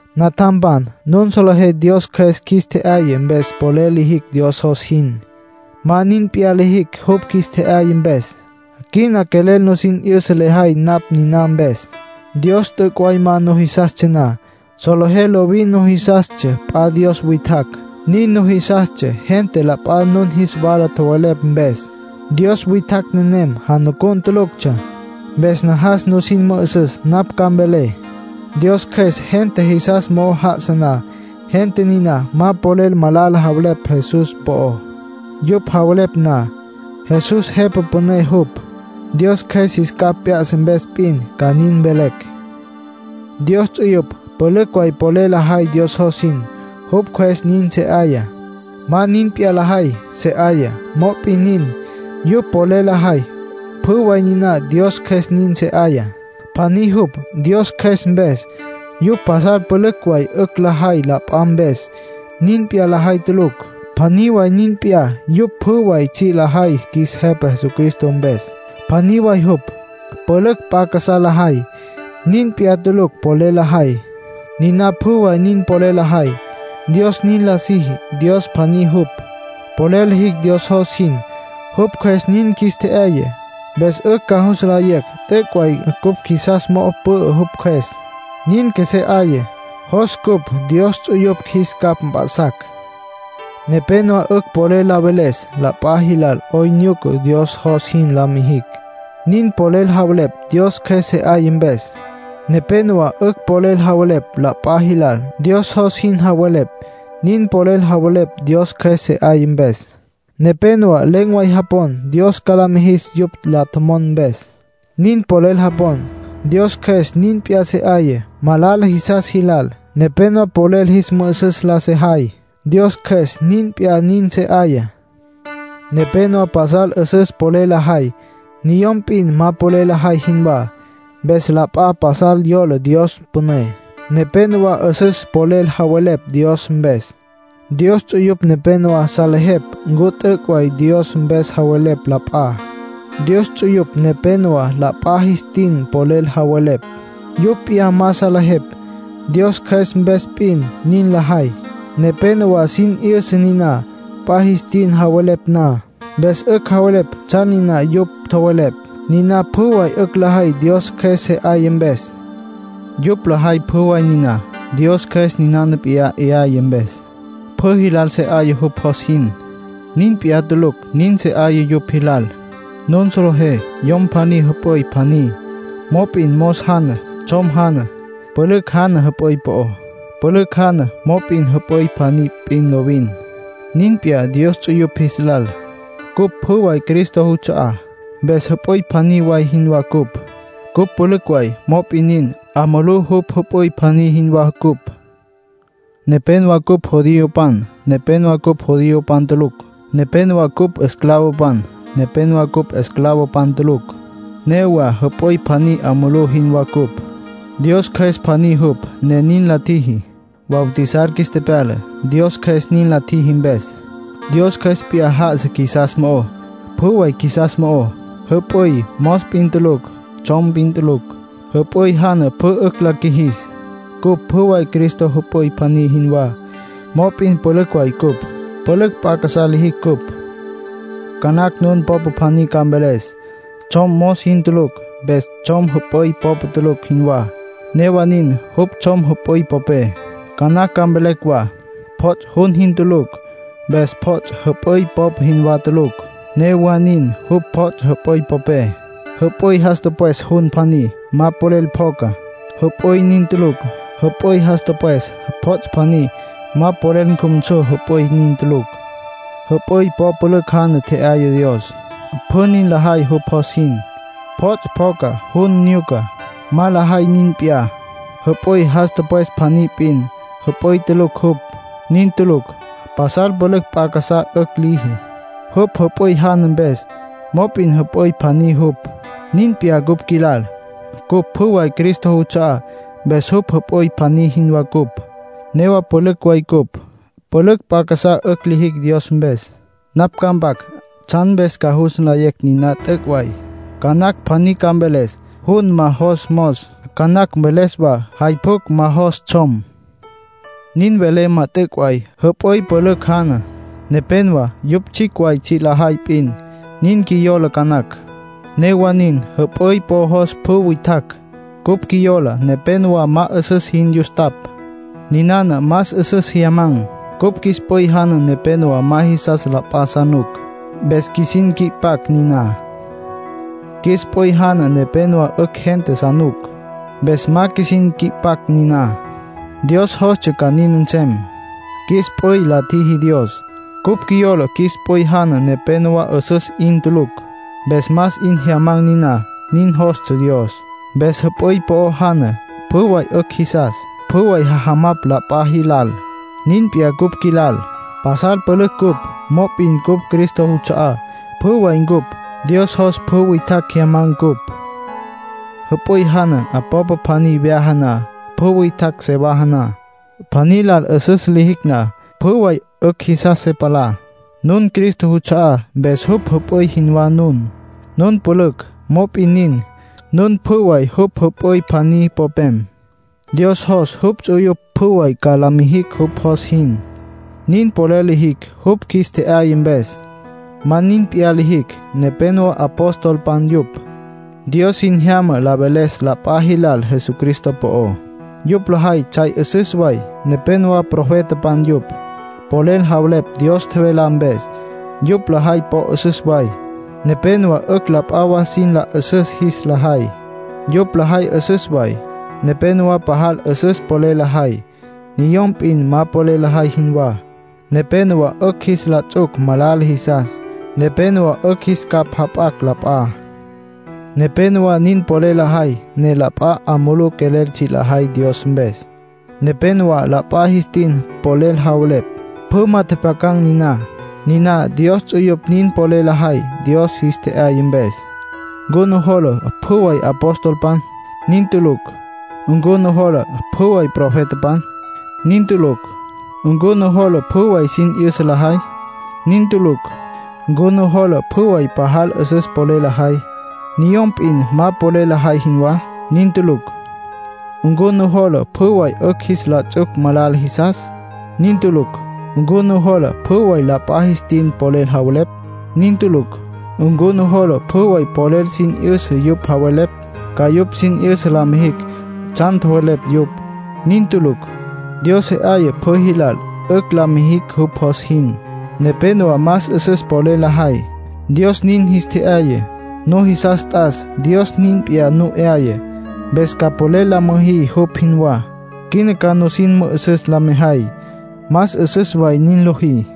Natjampan, nun solejé Dios Cjües qjuis tje'yaya mpes polel lijicj Dios jos jin. Ma nin p'iyá lijicj jupj qjuis tje'yaya mpes. Quina quelel nusin 'yüsa lejay napj niná mpes. Dios t'üc' way ma nujisastsja na, solejé lovin nujisastsja p'a dios witjacj. Nin nujisastsja gente la p'a nun jis wala tjowelepj mpes. Dios witjacj nenem janucun tuluctsja. Mpes najas nusin mü'üsüs napj ca mvelé. Dios Cjües gente jisas mo'o já'asa na, gente niná ma polel malala javelepj Jesús po'ó. Yupj javelepj na “Jesús Jepa Püné jupj”, Dios Cjües jis capj p'ya'sa mpes p'in ca nin mvelecj. Dios ts'uyupj pülücj way polel lajay Dios jos jin; jupj Cjües nin se 'aya. Ma nin p'iyá lajay se 'aya. Mop'in nin, yupj polel lajay, pjü way niná Dios Cjües nin se 'aya. Pjaní jupj. Dios Cjües mpes, yupj pasal pülücj way 'ücj lajay la p'a mpes. Nin p'iyá lajay tulucj. Pjaní way nin p'iyá. Yupj pjü way tsji' lajay qjuis Jepa Jesucristo mpes; pjaní way jupj. Pülücj p'a casá lajay. Nin p'iyá tulucj polel lajay. Niná pjü way nin polel lajay, Dios nin la siji. Dios pjaní jupj. Polel lijicj Dios jos jin, jupj Cjües nin qjuis tje'yaya. Mpes 'ücj ca jus nlayecj t'üc' way cupj qjuisas mo'o pü'ü jupj Cjües. Nin qjuesé 'aya, jos cupj Dios ts'uyupj jis capj mp'a'sacj. Nepénowa 'ücj polel la veles la p'a jilal 'oyn nyuca Dios jos jin la mijicj. Nin polel javelepj Dios Cjües se 'aya mpes. Nepénowa 'ücj polel la veles la p'a jilal, Dios jos jin salejepj. Nin polel javelepj Dios Cjües se 'aya mpes. Nepénowa len̈ way japon Dios ca la mijis yupj la tjomon mpes. Nin polel japon, Dios Cjües nin p'iyá se 'aya. Malala jisas jilal, nepénowa polel jis mü'ü'süs la sajay; Dios Cjües nin p'iyá nin se 'aya. Nepénowa pasal 'üsüs polel lajay, niyom p'in ma polel lajay jinwá, mpes la p'a pasal yola Dios püné. Nepénowa 'üsüs polel javelepj Dios mpes. Dios ts'uyupj nepénowa salejepj ncu t'üc' way Dios mpes javelepj la p'a. Dios ts'uyupj nepénowa la p'a jis tin polel javelepj, yupj p'iyá ma salejepj. Dios Cjües mpes p'in nin lajay. Nepénowa sin 'yüsa niná, p'a jis tin javelepj na, mpes 'ücj javelepj tsjan niná yupj tjowelepj. Niná pjü way 'ücj lajay Dios Cjües se 'aya mpes. Yupj lajay pjü way niná, Dios Cjües ninana p'iyá 'yaya mpes. Pjü jilal se 'aya, jupj jos jin. Nin p'iyá tulucj nin se 'aya yupj jilal. Nun solejé yom pjaní jüp'üy pjaní, mop'in mos jana, tsjom jana, pülücj jana jüp'üy po'ó. Pülücj jana, mop'in jüp'üy pjaní p'in lovin. Nin p'iyá Dios ts'uyupj jis lal. Cupj pjü way Cristo juts'a'á, mpes jüp'üy pjaní way jinwá cupj. Cupj pülücj way, mop'in nin, 'a mulú jupj jüp'üy pjaní jinwá cupj. Nepénowa cupj judiopan, nepénowa cupj judiopan tulucj. Nepénowa cupj esclavopan, nepénowa cupj esclavopan tulucj. Newa jüp'üy pjaní 'a mulú jinwá cupj; Dios Cjües pjaní jupj, ne nin la tjiji. Bautizar qjuis tepyala, Dios Cjües nin la tjiji mpes. Dios Cjües p'iyá já'asa qjuisas mo'ó, pjü way qjuisas mo'ó. Jüp'üy mos p'in tulucj. Tsjom p'in tulucj. Jüp'üy jana pjü 'ücj la qjuijis. Cupj pjü way Cristo jüp'üy pjaní jinwá, mop'in pülücj way cupj. Pülücj p'a casá lijicj cupj. Ca nacj nun popa pjaní ca mveles: “Tsjom mos jin tulucj, mpes tsjom jüp'üy popa tulucj jinwá”. Newa nin, jupj tsjom jüp'üy popé. Ca nacj ca mveles wa: “Pjots' jun jin tulucj, mpes pjots' jüp'üy popa jinwá tulucj”. Newa nin, jupj pjots' jüp'üy popé. Jüp'üy jas tüpwes jun pjaní, ma polel pjoca. Jüp'üy nin tulucj. Jüp'üy jas tüpwes pjots' pjaní, ma polel cjumsu. Jüp'üy nin tulucj. Jüp'üy po'o pülücj jana tje'yaya Dios. Pjü nin lajay jupj jos jin. Pjots' pjoca, jun nyuca. Ma lajay nin p'iyá. Jüp'üy jas tüpwes pjaní p'in, jüp'üy tulucj jupj. Nin tulucj. Pasal pülücj p'a casá 'ücj liji, jupj jüp'üy jana mpes. Mop'in jüp'üy pjaní jupj. Nin p'iyá cupj qjuilal. Cupj pjü way Cristo juts'a'á, mpes jupj jüp'üy pjaní jinwá ncupj. Newa pülücj way cupj; pülücj p'a casá 'ücj lijicj Dios mpes. Napj ca mpac tsjan mpes ca jus nlayé niná t'üc' way. Ca nacj pjaní ca mveles: “Jun ma jos mos”. Ca nacj mveles wa: “Jay pjucj ma jos tsjom”. Nin vele ma t'üc' way. Jüp'üy pülücj jana. Nepénowa yupj tsjicj way tsji' lajay p'in, nin qjuiyola ca nacj. Newa nin, jüp'üy po jos pjü witjacj. Cupj qjuiyola nepénowa ma 'üsüs jin yustapj. Niná más 'üsüs jyamacj. Cupj qjuis p'üy jana nepénowa ma qjuisas la p'a sa nuc. Mpes qjuisin qui'pacj niná. Qjuis p'üy jana nepenowá 'ücj gente sa nuc. Mpes ma qjuisin qui'pacj niná. Dios jostsja ca nin nsem; qjuis p'üy la tjiji Dios. Cupj qjuiyola qjuis p'üy jana nepenowá 'üsüs 'in tulucj. Mpes más 'in jyamacj niná. Nin jostsja Dios. Mpes jüp'üy po'o jana, pjü way 'ücj jisas. Pjü way jajamapj la p'a jilal. Nin p'iyá cupj qjuilal. Pasal pülücj ncupj, mop'in cupj Cristo juts'a'á, pjü way ncupj. Dios jos pjü witjacj jyamacj cupj. Jüp'üy jana popa pjaní vyaja na, pjü witjacj se vajana. Pjaní lal 'üsüs lijicj na, pjü way 'ücj jisas se palá. Nun Cristo juts'a'á, mpes jupj jüp'üy jinwá nun. Nun pülücj; mop'in nin, nun pjü way jupj jüp'üy pjaní popem. Dios jos jupj ts'uyupj pjü way ca la mijicj jupj jos jin. Nin polel lijicj, jupj qjuis tje'yaya mpes. Ma nin p'iyá lijicj. Nepénowa apostolpan yupj. Dios sin jyama la veles la p'a jilal Jesucristo po'ó. Yupj lajay tsjay 'üsüs way. Nepénowa profetapan yupj. Polel javelepj Dios tjevelá mpes. Yupj lajay po 'üsüs way. Nepénowa 'ücj la p'a wa sin la 'üsüs jis la jay. Yupj lajay 'üsüs way. Nepénowa pajal 'üsüs polel lajay, niyom p'in ma polel lajay jinwá. Nepénowa 'ücj jis la ts'uc malala jisas. Nepénowa 'ücj jis capj jap'acj la p'a. Nepénowa nin polel lajay ne la p'a 'a mulú quelel tsji' lajay Dios mpes. Nepénowa la p'a jis tin polel javelepj, pjü ma tjepjyacan̈ niná. Niná Dios ts'uyupj nin polel lajay, Dios jis tje'yaya mpes. ¿Ncu nujola pjü way apostolpan? Nin tulucj. ¿Ncu nujola pjü way profetapan? Nin tulucj. ¿Ncu nujola pjü way sin 'yüsa lajay? Nin tulucj. ¿Ncu nujola pjü way pajal 'üsüs polel lajay, niyom p'in ma polel lajay jinwá? Nin tulucj. ¿Ncu nujola pjü way 'ücj jis la ts'uc malala jisas? Nin tulucj. ¿Ncu nujola pjü way la p'a jis tin polel javelepj? Nin tulucj. ¿Ncu nujola pjü way polel sin 'yüsa yupj javelepj, ca yupj sin 'yüsa la mijicj tsjan tjowelepj yupj? Nin tulucj. Dios se 'aya pjü jilal, 'ücj la mijicj jupj jos jin. Nepénowa más 'üsüs polel lajay, Dios nin jis tje'yaya. Nujisas t'as Dios nin p'iyá nu 'yaya, mpes ca polel la müjí yupj jinwá. Quina ca sin mü'üsüs la mejay, más 'üsüs way nin lojí.